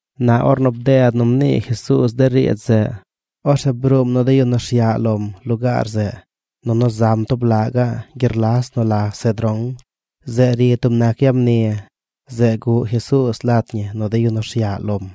Na ornu bded nu mnii Jesuuz de riidz zeꞌ, orzeꞌ bruum nu de yu nu rsyaꞌ lom lugaar zeꞌ nunu zam tub laꞌ gaꞌ gyerlas nu la Cedrón. Zeꞌ ri tub nac yag mni. Zeꞌ guꞌ Jesuuz lat ñi nu de yu nu rsyaꞌ lom.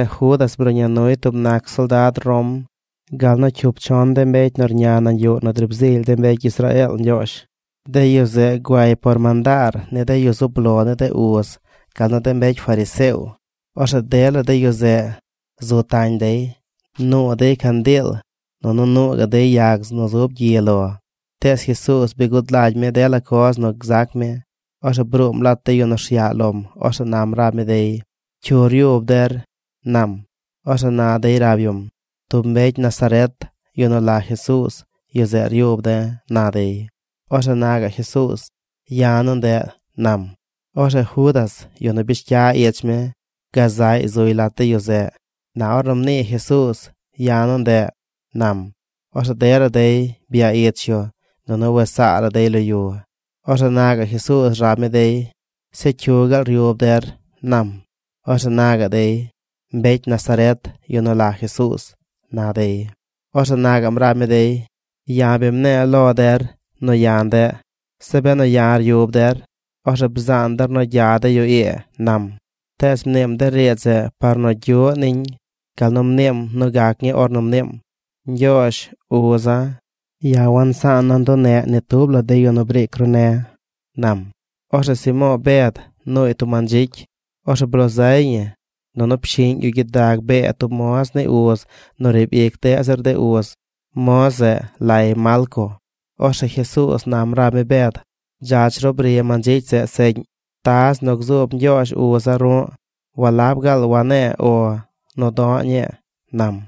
Orzeꞌ Judas bruꞌña nuy tub nac soldad Rom gal nu cyup chon de mbecy nu rña nañ yuꞌ nu driib zily de mbecy Israeel Ñgyoozh. De yu zeꞌ güay par mandaar ni de yu zub lo ni de uz gal nu de mbecy fariseo. Orzeꞌ dela de yu zeꞌ zu tañ dey. Nuu dey candiil, nunu nuu gaꞌ dey yag nu zub gyi lo. Tees Jesuuz bi gud lagy mi dela coz nu gzac mi. Orzeꞌ bruum lat de yu nu rsyaꞌ lom. Orzeꞌ nam rab mi dey: ―¿Cyu ryub der? ―nam. Orzeꞌ na dey rab yum: ―Tub mbecy Nazaret, yu nu la Jesuuz, yu zeꞌ ryub de̱ ―na dey. Orzeꞌ na gaꞌ Jesuuz: ―Ya̱ nu ndeꞌ ―nam. Orzeꞌ Judas, yu nu bish cya ich mi, gazaꞌy zuy lat de yu zeꞌ. Na ornu mnii Jesuuz: “Ya̱ nu ndeꞌ”, nam, orzeꞌ dela dey bya ich yu nunu wes saa la dey lo yu. Orzeꞌ na gaꞌ Jesuuz rab mi dey: ―¿Zeꞌ cyu gaal ryub der? ―nam. Orzeꞌ na gaꞌ dey: ―Mbecy Nazaret. Yu nu la Jesuuz ―na dey. Orzeꞌ na gaꞌm rab mi dey: ―Ya̱ bi mne̱e̱ lo der nu ya̱ ndeꞌ. Zeꞌ benu ya̱ ryub der, orzeꞌ bzaan der nu gya de yu ii ―nam. Tees mniim de riidz zeꞌ par nu gyuꞌ niñ gal nu mniim nu gac ñii ornu mniim: “Ñgyoozh, uza̱, ya̱ wansaana̱ nduneꞌ ni tub la de yu nu briic ru ne̱”, nam. Orzeꞌ Simo̱o̱ Bed nuuy tub mandzicy. Orzeꞌ bloo zay ñi nunu pshiꞌñ yu gyidag bee tub moz ni uz nu riib ic deꞌ zir de uz. Moz zeꞌ lay Malco. Orzeꞌ Jesuuz nam rab mi Bed: ―Dzach ru bri mandzicy zeꞌ seꞌñ. Taz nu gzuub Ñgyoozh, uza̱, ru̱ꞌ, ¿walab gaal wane̱e̱ “O” nu do̱ꞌ ñii? ―nam.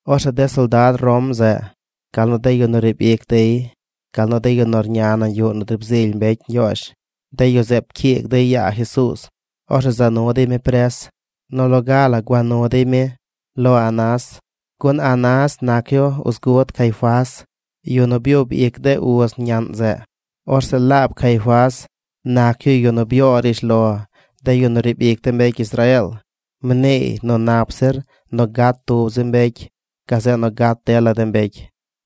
Orzeꞌ de soldad Rom zeꞌ gal nu de yu nu riib ic dey gal nu de yu nu rña yuꞌ nu driib zily mbecy Ñgyoozh, de yu zeꞌ pcyiig dey yaa Jesuuz. Orzeꞌ za nu dey mi pres. Nu loga la gua nu dey mi lo Anás. Gun Anás nac yu uz gud Caifás, yu nu byub ic de uz ñaꞌn zeꞌ. Orzeꞌ laab Caifás nac yu yu nu byoo rishlo de yu nu riib ic de mbecy Israeel. Mniiy nu nap zir nu gat tub zi mbecy gazeꞌ nu gat dela de mbecy.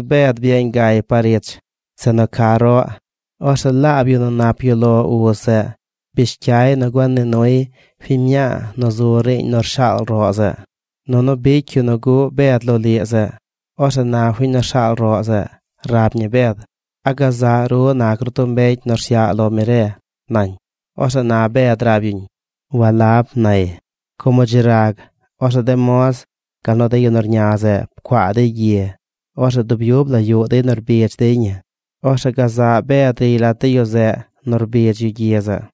Tees Bed byeeñ gay par ich zeꞌ nu ca roꞌ. Orzeꞌ laab yu nu nap yuꞌ lo uz zeꞌ bish cyay nu gua nii nuy fiñ mñaa nu zu riiñ nu rshaal roꞌ zeꞌ. Nunu bicy yu nu guꞌ Bed loliꞌ zeꞌ. Orzeꞌ na fiñ nu rshaal roꞌ zeꞌ rab ñi Bed: ―¿A gazaꞌ ru nac ru tub mbecy nu rsyaꞌ lo mi re? ―nañ. Orzeꞌ na Bed rab yuñ: ―Walab ―nay. Como dzi rag, orzeꞌ de moz gal nu de yu nu rña zeꞌ pcuaa dey gyi. Orzeꞌ dub yub la yuꞌ dey nu rbidz dey ñi. Orzeꞌ gazaꞌ Bed riy lat de yu zeꞌ nu rbidz yu gyi zeꞌ.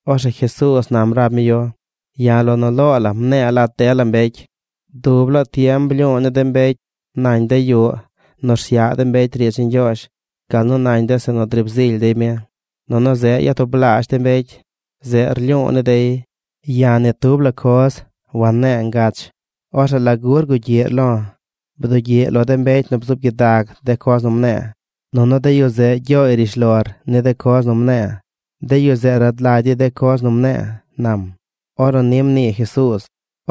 Orzeꞌ Jesuuz nam rab mi yu: ―Ya̱ lo nu loo la mne̱e̱ lat dela mbecy. Dub laa tiem blyu̱u̱ ni de mbecy nañ de yuꞌ nu rsyaꞌ mbecy riidz ni Ñgyoozh gal nu nañ yuꞌ zeꞌ nu driib zily dey mi. Nunu zeꞌ nu yatublaazh de mbecy, zeꞌ rlyu̱u̱ ni dey. Ya̱ ni tub la coz wanne̱e̱ ngach. ¿Orzeꞌ lagu rgugyiꞌr lo̱? Bdugyiꞌ lo de mbecy nu bzuub gyidag de coz nu mne̱e̱, nunu de yu zeꞌ gyooy rishlor ni de coz nu mne̱e̱. De yu zeꞌ rad lagy dey de coz nu mne̱e̱ ―nam. Ornu ni mnii Jesuuz,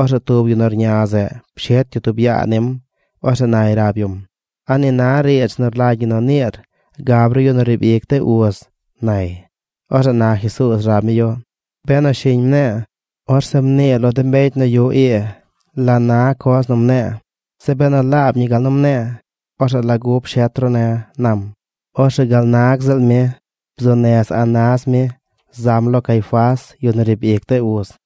orzeꞌ tub yu nu rña zeꞌ pshet yu tub yaa nim. Orzeꞌ nay rab yum: ―¿A ni na riidz nu rlagy ñi nu niir gab ru yu nu riib ic de uz? ―nay. Orzeꞌ na Jesuuz rab mi yu: ―Benu shiñ mne̱e̱, orzeꞌ mnii lo de mbecy nu yuꞌ ii la na coz nu mne̱e̱. Zeꞌ benu laab ñi gal nu mne̱e̱, ¿orzeꞌ lagu pshet ru ne̱? ―nam. Orzeꞌ gal nag ziꞌl mi bzuu nez Anás mi zam lo Caifás, yu nu riib ic de uz.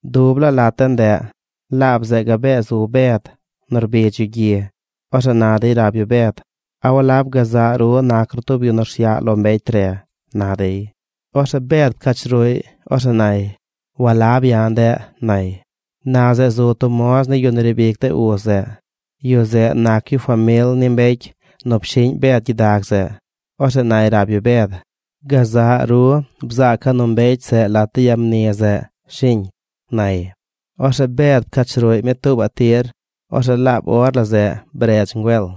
Dub laa lat de ndeꞌ, laab zeꞌ gabee zu Bed nu rbidz yu gyi. Orzeꞌ na dey rab yu Bed: ―¿A walab gazaꞌ ru nac ru tub yu nu rsyaꞌ lo mbecy re? ―na dey. Orzeꞌ Bed pcach ruꞌy. Orzeꞌ nay: ―Walab ya̱ ndeꞌ ―nay. Na zeꞌ zu tub moz ni yu nu riib ic de uz zeꞌ. Yu zeꞌ nac yu famil ni mbecy nu pshiꞌñ Bed gyidag zeꞌ. Orzeꞌ nay rab yu Bed: ―Gazaꞌ ru bzaaca̱ nu mbecy zeꞌ lat de yag mni zeꞌ, ¿shiñ? ―nay. Orzeꞌ Bed pcach ruꞌy mi tuubaꞌ tir. Orzeꞌ laab or la zeꞌ bredz ngüel.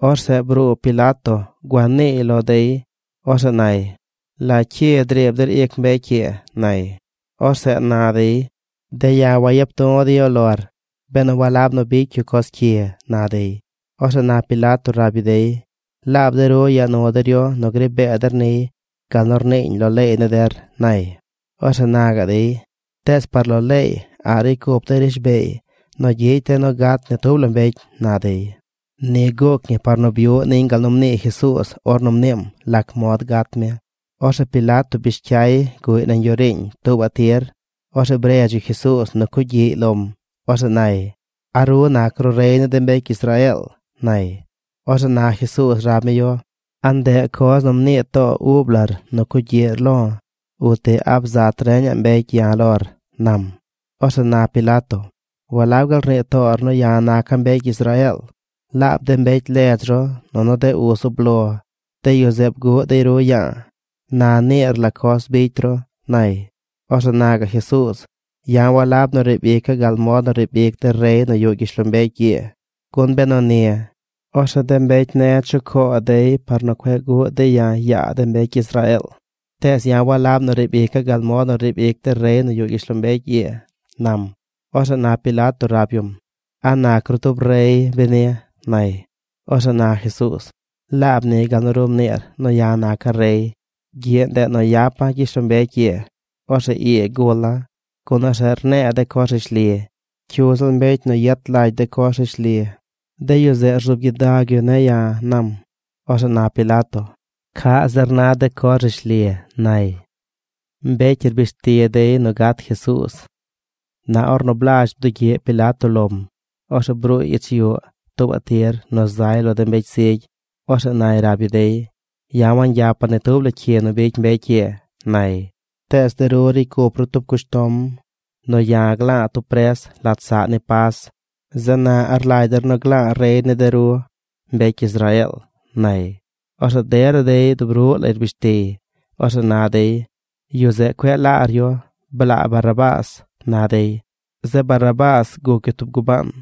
Orzeꞌ bruu Pilato gua niiy lo dey. Orzeꞌ nay: ―¿La cyi driib der ic mbecy ii? ―nay. Orzeꞌ na dey: ―De̱ ya̱ wayap du̱ de̱ yu lor benu walab nu bicy yu coz cyi ―na dey. Orzeꞌ na Pilato rab yu dey: ―Laab de ru yaa nu der yu nu gri bee der niy gal nu rniiñ lo leey ni der ―nay. Orzeꞌ na gaꞌ dey: ―Tees par lo leey a̱ꞌ ricy cup de̱ rishbeey nu gyicy de̱ nu gat ni tub la mbecy ―na dey. Ni guuc ñi par nu byuꞌ niñ gal nu mnii Jesuuz ornu mniim lac mod gat mi. Orzeꞌ Pilato bish cyay guꞌy nañ yuꞌ riiñ tuubaꞌ tir. Orzeꞌ bredz yu Jesuuz nu cugyiꞌy lom. Orzeꞌ nay: ―¿A ru nac ru rey ni de mbecy Israeel? ―nay. Orzeꞌ na Jesuuz rab mi yu: ―¿A ndeꞌ coz nu mnii too ub lar nu cugyiꞌr lo̱? Uti ¿a bzat reñaꞌ mbecy ya̱ lor? ―nam. Orzeꞌ na Pilato: ―¿Walab gaal rnii toor nu ya̱ naca̱ mbecy Israeel? Laab de mbecy ledz ru nunu de uz zub lo, de yu zeꞌ bguꞌ dey ru ya̱a̱. Na niir la coz bicy ru ―nay. Orzeꞌ na gaꞌ Jesuuz: ―Ya̱ walab nu riib ica̱ gal mod nu riib ic de rey nu yuꞌ gyishlombecy ii. Gun benu ni, orzeꞌ de mbecy ne̱ chucoo dey par nu cueꞌ guꞌ dey ya̱ yaa de mbecy Israeel. Tees ya̱ walab nu riib ica̱ gal mod nu ricy de rey nu yuꞌ gyishlombecy ii ―nam. Orzeꞌ na Pilato rab yum: ―¿A nac ru tub rey, beni? ―nay. Orzeꞌ na Jesuuz: ―Laab ni gal nu ru mniir nu ya̱ naca̱ rey. Gyiꞌ ndeꞌ nu yapa̱ gyishlombecy ii. Orzeꞌ ii gula̱, gun orzeꞌ rne̱e̱ de coz rishli. Cyu ziꞌl mbecy nu yet lagy de coz rishli, de yu zeꞌ rzuub gyidag yu ne̱ ya̱ ―nam. Orzeꞌ na Pilato: ―¿Caꞌ zir na de coz rishli? ―nay. Mbecy rbish ti dey nu gat Jesuuz Na ornu blazh bdugyiꞌ Pilato lom, orzeꞌ bruuy ich yuꞌ tuubaꞌ tir nu zay lo de mbecy zigy. Orzeꞌ nay rab yu dey: ―Ya̱ wagyapa̱ ni tub la cyi nu bicy mbecy ii ―nay―. Tees de ru ricy cup ru tub cushtom nu ya̱ gla̱a̱ tub pres lat saꞌ ni Pas. ¿Zeꞌ na a rlagy der nu gla̱a̱ rey ni de ru, mbecy Israeel? ―nay. Orzeꞌ dela dey dub ruꞌ lay rbrish tiy. Orzeꞌ na dey: ―¡Yu zeꞌ cueꞌ laar yu! ¡Blaa Barrabás! ―na dey. Zeꞌ Barrabás guc yu tub gubaan.